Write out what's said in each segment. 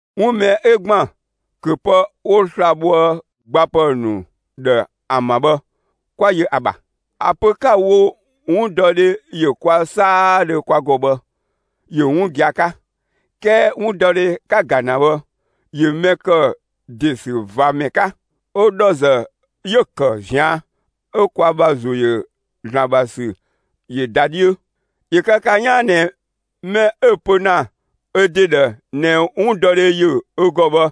'Wun mɛ 'ö ‑gban ‑köpë 'wo sla‑ bhoë gbapë ‑nu ‑dhë ‑an ‑bha bhë, 'kwa yö ‑a ‑bha. ‑A pö 'ka‑ wo: 'Wundɔdhe ‑yö kwa 'saadhö kwa ‑gɔ bhë, ‑yö 'wun gia‑ 'ka. 'Kɛɛ 'wundɔdhe 'ka‑ ‑ga ‑na bhë ‑yö mɛ ‑kë ‑desüvamɛ 'ka; 'ö ‑dhɔ ‑zë 'yö‑ ‑kë ꞊zian' 'ö kwa ‑bha ‑zo ‑yö ‑Zlan ‑bha ‑sü ‑yö ‑da 'dhiö. ‑Yö kë ka 'yaan ꞊nɛ mɛ 'ö‑ pö ‑na ö ‑de ‑dhë ꞊nɛ 'wundɔdhe ‑yö ö ‑gɔ bhë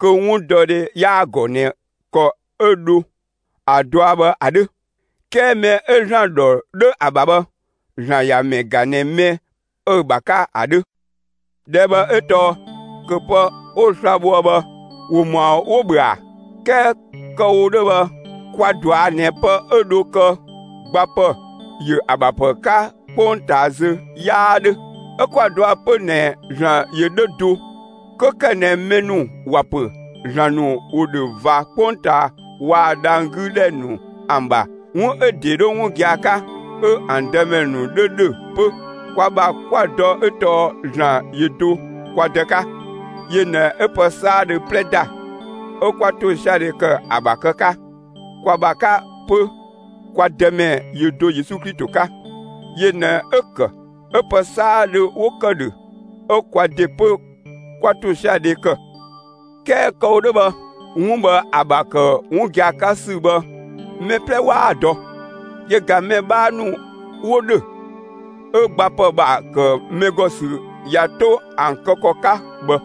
kö 'wundɔdhe 'yaa‑ ‑gɔ ꞊nɛ ‑kɔ 'ö dho ‑a dɔa bhë ‑a 'dhö. 'Kɛɛ mɛ 'ö ‑Zlan ‑dhɔ 'dho ‑a ‑bha bhë, ‑Zlan ‑ya ‑mɛ ‑ga ꞊nɛ mɛ 'ö‑ ‑bha 'ka ‑a 'dhö. ꞊Dhɛɛ' bhë 'ö tɔɔ: ‑Köpë 'wo sla‑ bhoë bhë, ‑wo ‑mɔa 'wo‑ ‑bhö ‑a? 'Kɛɛ kë‑ wo 'dhö bhë kwa‑ ꞊dɔa' ꞊nɛ pë 'ö dho kë gbapë ‑yö ‑a ‑bha ‑pë 'ka 'kpongtaa zö 'yaa 'dhö; 'ö 'kwa‑ dɔa 'pö ꞊nɛ ‑Zlan ‑yö 'dhö do. 'Kö ‑kë ꞊nɛ mɛ ‑nu ‑wa ‑pö ‑zlan ‑nu ‑wo ‑dhö ꞊va 'kpongtaa waa‑ dhang‑ 'gü ‑dhɛ ‑nu ‑an ‑bha, 'wun 'ö ‑dee 'dhö 'wun gia‑ 'ka, 'ö ‑an dëmɛ ‑nu 'dhö ‑dhö 'pö, kwa ‑bha 'kwa‑ dɔ 'ö tɔɔ ‑Zlan ‑yö do kwa Dë 'ka. Yö ꞊nɛ 'ö pë 'saadhö 'plɛ ‑da; 'ö 'kwa ‑tosiadhe ‑kë ‑a ‑bha kë 'ka. Kwa ‑bha 'ka 'pö, kwa Dëmɛ ‑yö do Yesu Klito 'ka. Yö ꞊nɛ 'ö‑ ‑kë 'ö pë 'saadhö 'wo ‑kë ‑dhö 'ö kwa ‑de 'pö 'kwa ‑tosiadhe ‑kë. 'Kɛɛ kë‑ wo 'dhö bhë 'wun bhë ‑a ‑bha ‑kë 'wun gia‑ 'ka ‑sü bhë, mɛ 'plɛ 'waa‑ dɔ; yö ꞊ga mɛ 'bhaa ‑nu 'wo ‑dhö 'ö gbapë ‑bha ‑kë mɛ ‑gɔ ‑sü ꞊ya 'to ‑an kë ‑kɔ 'ka bhë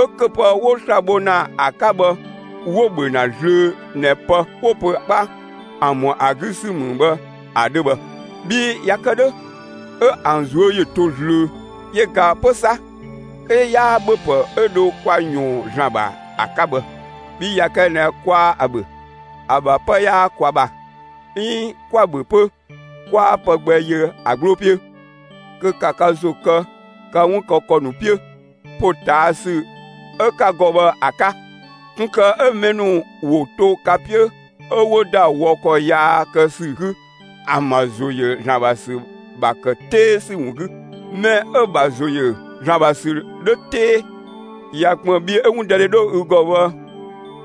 'ö ‑köpë 'wo sla‑ bho ‑na ‑a 'ka bhë 'wo‑ ‑bhö ‑na zlöö ꞊nɛ pë 'wo‑ pö 'kpa ‑an ‑mɔ ‑a 'gü ‑sü ‑mü bhë ‑a 'dhö bhë. Bhii ꞊ya kë 'dhö 'ö ‑an ꞊zuö' ‑yö to zlöö. Yö ꞊ga 'pö 'sa, 'ö 'yaa ‑bhöpë 'ö dho kwa ꞊yɔɔn ‑Zlan ‑bha ‑a 'ka bhë, bhii ꞊ya kë ꞊nɛ 'kwaa ‑a ‑bhö, ‑a ‑bha 'pë 'yaa kwa ‑bha; 'iin 'kwa‑ ‑bhö 'pö, 'kwaa pë gbɛ yö ‑a 'gbloo 'piö. Kö ‑ka ka ‑zo kë ka 'wun kë ‑kɔ ‑nu 'piö ‑potaasü 'ö ka ‑gɔ bhë ‑a 'ka, ꞊kun ‑kë 'ö mɛ ‑nu ‑wo to ka 'piö 'ö 'wo ‑da wɔ ‑kɔ yaa kë ‑sü 'gü ‑an ‑bha ‑zo ‑yö ‑Zlan ‑bha ‑sü ‑bha ‑kë 'tee ‑sü ‑wun 'gü. Mɛ 'ö‑ ‑bha ‑zo ‑yö ‑Zlan ‑bha ‑sü 'dhö 'tee, ꞊ya ‑kpën bhi 'ö 'wundɔdhe 'dhö ü ‑gɔ bhë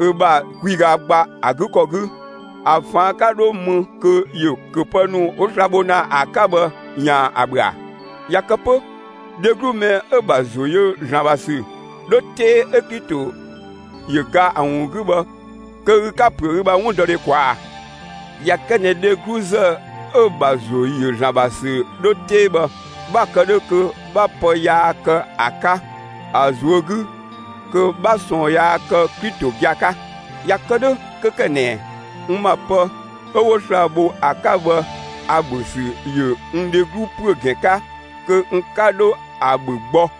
ü ‑bha kwiga ‑gba ‑a 'gü ‑kɔ 'gü, ‑a ꞊faan' 'ka 'dho më kö ‑yö ‑köpë ‑nu 'wo sla‑ bho ‑na ‑a 'ka bhë ‑yaan ‑a ‑bhö ‑a? ꞊Ya kë 'pö, dheglu ‑mɛ 'ö‑ ‑bha ‑zo ‑yö ‑Zlan ‑bha ‑sü 'dhö 'tee 'ö Klito ‑yö ga ‑a ‑wun 'gü bhë kö ü 'ka‑ ‑püö ü ‑bha 'wundɔdhe ꞊kwaa' ꞊a? ꞊Ya kë ꞊nɛ dhegluzë 'ö‑ ‑bha ‑zo ‑yö ‑Zlan ‑bha ‑sü 'dho 'tee bhë, 'bha‑ kë 'dhö kö 'bha pë yaa kë ‑a 'ka ‑a ꞊zuö' 'gü kö 'bha ꞊sɔɔn yaa kë Klito gia‑ 'ka. ꞊Ya kë 'dhö, 'kö ‑kë ꞊nɛ n ‑ma pë 'ö 'wo sla‑ bho ‑a 'ka bhë ‑a ‑bhö ‑sü ‑yö n dheglu ‑püö ‑gɛn 'ka, kö n 'ka dho ‑a ‑bhö gbɔ.